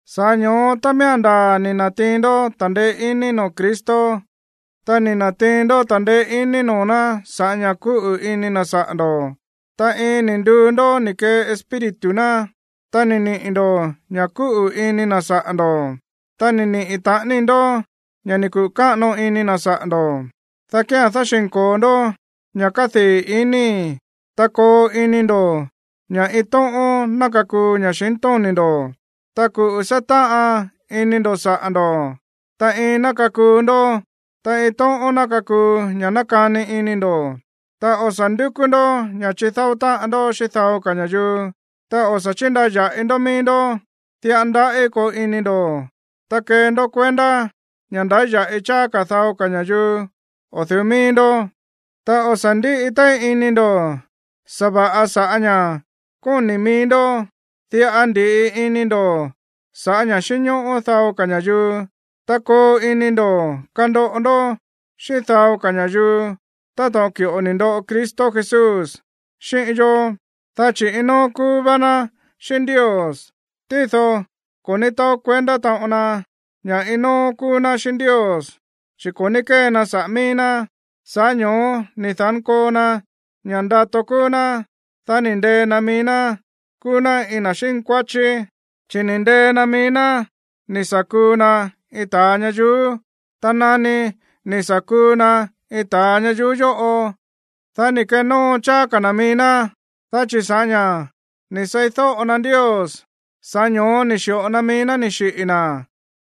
Sa̱ꞌá ño̱ó, tá miía̱n ndaa̱ ni̱ na̱tiin ndó ta̱ndeé iní noo̱ Cristo, ta ni̱ na̱tiin ndó ta̱ndeé iní noo̱ ná sa̱ꞌá ña̱ kúꞌu̱ ini na̱ saꞌa̱ ndo̱, ta iin ni̱ nduu ndó ni̱ kee Espíritu ná, ta ni̱ niꞌi̱ ndo̱ ña̱ kúꞌu̱ ini na̱ saꞌa̱ ndo̱, ta ni̱ niꞌi̱ taꞌani ndó ña̱ ni̱ kuꞌu̱ káꞌano ini na̱ saꞌa̱ ndo̱, dá kía̱n dáxi̱nko̱o ndó ña̱ kádii̱ inii̱, ta koo ini ndo̱ ña̱ iin tóꞌón ná kakuu ña̱xintóni̱ ndo̱, ta kuꞌu̱ sátáꞌan ini ndo̱ saꞌa̱ ndo̱, ta iin ná kakuu ndó, ta iin tóꞌón ná kakuu ña̱ nákani ini ndo̱. Ta o̱ sa̱ ndúkú ndó ña̱ chidáó táꞌan ndó xíꞌín dao ka̱ ña̱yuu, ta o̱ sa̱ chíndaya̱ꞌi ndó mií ndó. Diꞌa ndaꞌí koo ini ndo̱, ta kee ndó kuendá ña̱ ndáya̱ꞌi cháá ka̱ dao ka̱ ña̱yuu o̱ du̱ú mií ndó. Ta o̱ sa̱ ndíꞌi téí ini ndo̱ sa̱va̱ꞌa sa̱ꞌá ña̱ kóni̱ mií ndó, diꞌa ndi̱ꞌi ini ndo̱ sa̱ꞌá ña̱ xínñóꞌó dao ka̱ ña̱yuu. Ta koo ini ndo̱ kandoꞌo ndó xíꞌín dao ka̱ ña̱yuu táto̱ꞌon ki̱ꞌo ni̱ ndoꞌo Cristo Jesús xíꞌín yó, dá chi̱ iin nóó kúú vá ná xíꞌín Ndios, tído ko̱ ní taó kuendá taꞌon na ña̱ iin nóó kúú ná xíꞌín Ndios, chi̱ ko̱ ní kée na saꞌa̱ mií ná, sa̱ꞌá ño̱ó ni̱ da̱nkoo na ña̱ ndato kúú ná, dá ni̱ ndee na mií ná kúú ná iin na̱ xínkuáchí, chi̱ ni̱ ndee na mií ná ni̱ sa̱ kuu na iin ta̱a ñayuú. Ta nani ni̱ sa̱ kuu na iin ta̱a ñayuú yóꞌo, dá ni̱ kenóo cháá ka̱ na̱ mií ná, dá chi̱ sa̱ꞌá ña̱ ni̱ seídóꞌo na Ndios, sa̱ꞌá ño̱ó ni̱ xi̱ꞌo na mií ná ni̱ xiꞌi̱ na̱,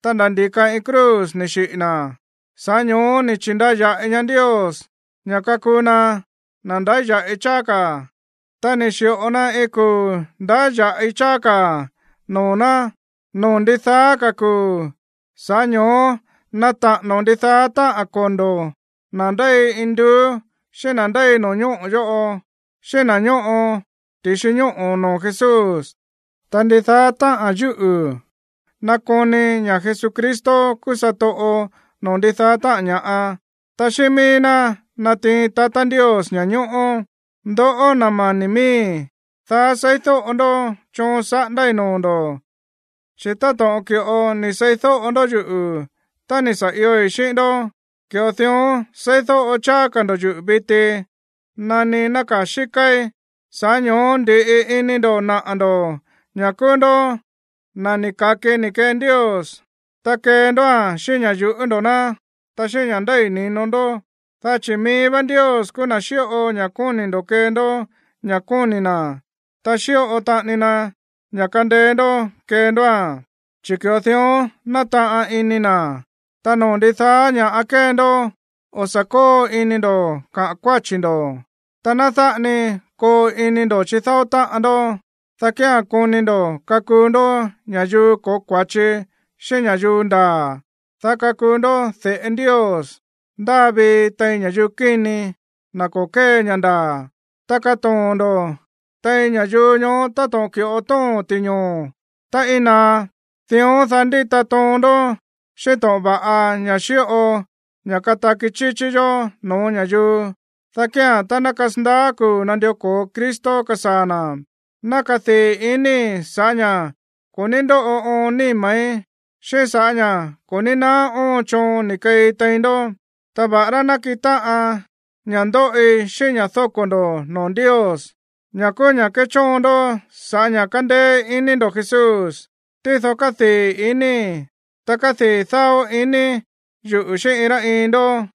ta nda̱ ndi̱ka iin cruz ni̱ xiꞌi̱ na̱. Sa̱ꞌá ño̱ó ni̱ chi̱ndaya̱ꞌi ñaá Ndios ña̱ kakuu na na̱ ndáya̱ꞌi cháá ka̱, ta ni̱ xi̱ꞌo na iin kuu̱ ndáya̱ꞌi cháá ka̱ noo̱ ná noo̱ ndidaá ka̱ kuu̱. Sa̱ꞌá ño̱ó nata̱ꞌa̱no̱ ndidaá táꞌa̱n kondo̱ na̱ ndéi induú, xíꞌín na̱ ndéi no̱ñóꞌo̱ yóꞌo, xíꞌín na̱ ñóꞌo ti̱xi ñóꞌo̱ noo̱ Jesús, ta ndidaá táꞌa̱n yúꞌu̱ nakoni ña̱ Jesucristo kúú satoꞌo noo̱ ndidaá táꞌa̱n ña̱ꞌa, ta xíꞌín mií ná natiin tatá Ndios ña̱ñóꞌó. Ndoꞌó, na̱ mani̱ miíi̱, daá seídóꞌo ndó choon saꞌándái̱ noo̱ ndo̱, chi̱ táto̱ꞌon ki̱ꞌo ni̱ seídóꞌo ndó yuꞌu̱ tá ni̱ sa̱ ioi̱ xíꞌín ndó, ki̱ꞌo dión seídóꞌo cháá ka̱ ndo̱ yuꞌu̱ viti nani nákaa̱ xíkáí. Sa̱ꞌá ño̱ó ndi̱ꞌi ini ndo̱ naꞌa̱ ndo̱ ña̱ kúú ndó na̱ ni̱ ka̱ki ni̱ kee Ndios. Ta kee ndóa̱n xíꞌín ña̱ yu̱ꞌú ndo̱ ná, ta xíꞌín ña̱ ndéi ni̱no ndó. Dá chi̱ mií vá Ndios kúú na̱ xíꞌo ña̱ kóni̱ ndo̱ kee ndó ña̱ kóni̱ na̱, ta xíꞌo taꞌani na ña̱ kándéé ndó kee ndóa̱n, chi̱ ki̱ꞌo dión nátaꞌan ini na̱. Ta noo̱ ndidaá ña̱ꞌa kée ndó, o̱ sa̱ kóo ini ndo̱ kaꞌa̱n kuáchi̱ ndo̱, ta ná dáꞌa ni koo ini ndo̱ chidáó táꞌan ndó, dá kía̱n koni ndo̱ kakuu ndó ña̱yuu ko̱ó kua̱chi xíꞌín ña̱yuu ndaa̱, dá kakuu ndó de̱ꞌe Ndios ndáa vii tein ña̱yuu kíni, na̱ ko̱ kée ña̱ ndaa̱. Ta katoo̱n ndo̱ tein ña̱yuu ñoó táto̱ꞌon ki̱ꞌo tóo̱n ti̱ñoo̱ tá íin naá. Dión, dá ndita toon ndó xíꞌín to̱ꞌon va̱ꞌa ña̱ xíꞌo ña̱ kataki chíchí yó no̱ó ña̱yuu. Dá kía̱n, tá ná kasandaá kuu̱ nandió ko̱o Cristo kasaa̱ na̱, ná kadii̱ iníi̱ sa̱ꞌá ña̱ ko̱ ní ndóꞌo oon níma̱í, xíꞌín sa̱ꞌá ña̱ ko̱ ní naá óon choon ni̱ keei tein ndó. Ta va̱ꞌará nakiꞌin táꞌan ña̱ ndóꞌi xíꞌín ña̱ dóko̱ ndo̱ noo̱ Ndios, ña̱ kúú ña̱ kéchóon ndó sa̱ꞌá ña̱ kándéé iní ndo̱ Jesús, tído kádii̱ iníi̱, ta kádii̱ dáó ini yuꞌu̱ xíꞌín iin rá iin ndó.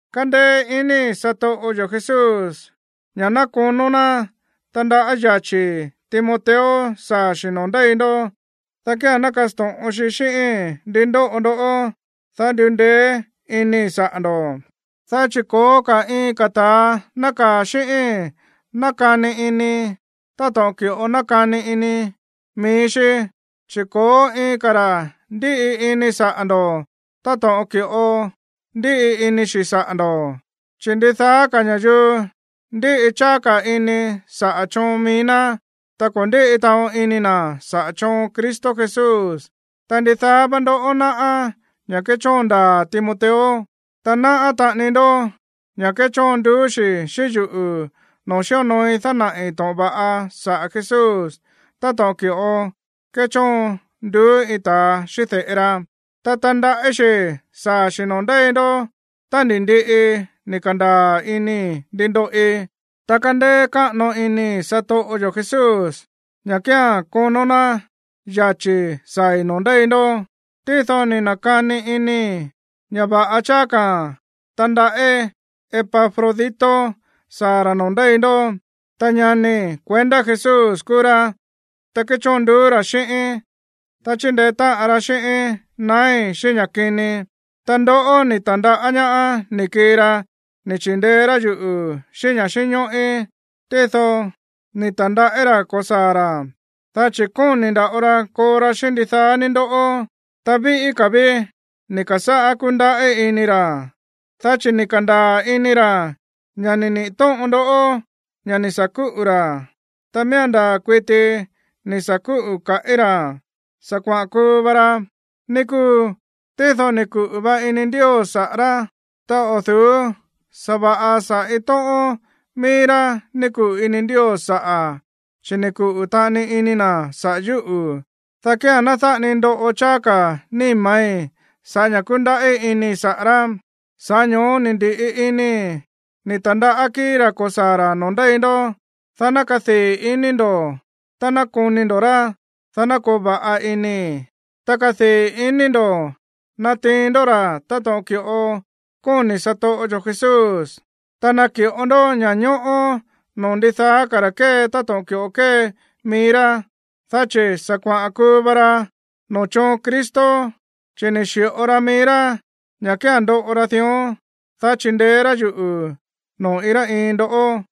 Kándéé inii̱ satoꞌo yo̱ Jesús ña̱ ná konó ná tandaꞌá yachi̱i̱ Timoteo saa̱ xi̱ noo̱ ndéi ndó, dá kía̱n ná kasto̱ꞌon xi xíꞌíi̱n ndí ndóꞌo ndó, dá ndundeé iníi̱ saꞌa̱ ndo̱. Dá chi̱ ko̱ó ka̱ iin ka̱ ta̱a nákaa̱ xíꞌíi̱n nákani ini táto̱ꞌon ki̱ꞌo nákani ini mií xí, chi̱ ko̱ó iin ka̱ ra̱ ndíꞌi ini saꞌa̱ ndo̱ táto̱ꞌon ki̱ꞌo ndíꞌi ini xi̱ saꞌa̱ ndo̱. Chi̱ ndidaá ka̱ ña̱yuu ndíꞌi cháá ka̱ ini saꞌa̱ choon mií ná, ta ko̱ ndíꞌi taꞌon ini na̱ saꞌa̱ choon Cristo Jesús. Ta ndidaá vá ndoꞌó náꞌá ña̱ kéchóon ndaa̱ Timoteo, ta náꞌá taꞌani ndó ña̱ kéchóon nduú xi̱ xíꞌín yuꞌu̱ noo̱ xíonooi dánaꞌi̱ to̱ꞌon va̱ꞌa saꞌa̱ Jesús táto̱ꞌon ki̱ꞌo kéchóon nduú iin tatá xíꞌín de̱ꞌe ra. Ta tandaꞌí xi̱ saa̱ xi̱ noo̱ ndéi ndó tá ni̱ ndiꞌi ni̱ ka̱ndaa̱ inii̱ ndi ndoꞌi. Ta kándéé káꞌano inii̱ satoꞌo yo̱ Jesús ña̱ kía̱n konó ná yachi̱ saa̱i̱ noo̱ ndéi ndó. Tído ni̱ na̱kani inii̱ ña̱ va̱ꞌa cháá ka̱ tandaꞌí Epafrodito saa̱ ra̱ noo̱ ndéi ndó. Ta ñanii̱ kuendá Jesús kúú rá, ta kéchóon nduú ra̱ xíꞌíín, ta chíndeé táꞌan ra xíꞌíín naái̱ xíꞌín ña̱ kini. Ta ndoꞌó ni̱ ta̱ndaꞌá ñaá ni̱ kii ra ni̱ chi̱ndeé rá yuꞌu̱ xíꞌín ña̱ xínñóꞌí. Tído ni̱ ta̱ndaꞌí ra̱ ko̱saa̱ ra̱, dá chi̱ kóni̱ nda̱ꞌo ra koo ra xíꞌín ndidaá ní ndoꞌó, ta víꞌí ka̱ ví ni̱ ka̱sáꞌá kúndaꞌí ini ra̱, dá chi̱ ni̱ ka̱ndaa̱ ini ra̱ ña̱ ni̱ niꞌi̱ tóꞌon ndó ña̱ ni̱ sa̱ kúꞌu̱ ra̱. Ta miía̱n ndaa̱ kuiti ni̱ sa̱ kúꞌu̱ kaꞌí ra̱, sa̱ kuaꞌa̱n kuu va ra, ní kúu. Tído ni̱ kuꞌu̱ va ini Ndios saꞌa̱ rá, ta o̱ du̱ú sa̱va̱ꞌa saꞌa̱ iin tóꞌón mií rá ni̱ kuꞌu̱ ini Ndios saꞌa̱, chi̱ ni̱ kuꞌu̱ taꞌani ini na̱ saꞌa̱ yúꞌu̱, dá kía̱n ná dáꞌa ni ndoꞌo cháá ka̱ níma̱í sa̱ꞌá ña̱ kundaꞌí inii̱ saꞌa̱ rá. Sa̱ꞌá ño̱ó ni̱ ndi̱ꞌi inii̱ ni̱ ta̱ndaꞌá kíi̱í ra̱ ko̱saa̱ ra̱ noo̱ ndéi ndó, dá ná kadii̱ ini ndo̱ tá ná koni ndo̱ rá, dá ná koo va̱ꞌa inii̱. Ta kadii̱ ini ndo̱ natiin ndó ra̱ táto̱ꞌon ki̱ꞌo kóni̱ satoꞌo yo̱ Jesús, ta naki̱ꞌo ndó ña̱ñóꞌó noo̱ ndidaá ka̱ ra̱ kée táto̱ꞌon ki̱ꞌo kée mií rá, dá chi̱ sa̱ kuaꞌa̱n kuu va ra noo̱ choon Cristo, chi̱ ni̱ xi̱ꞌo ra mií rá ña̱ kía̱n ndoꞌo ra dión, dá chindeé rá yuꞌu̱ noo̱ iin rá iin ndoꞌó.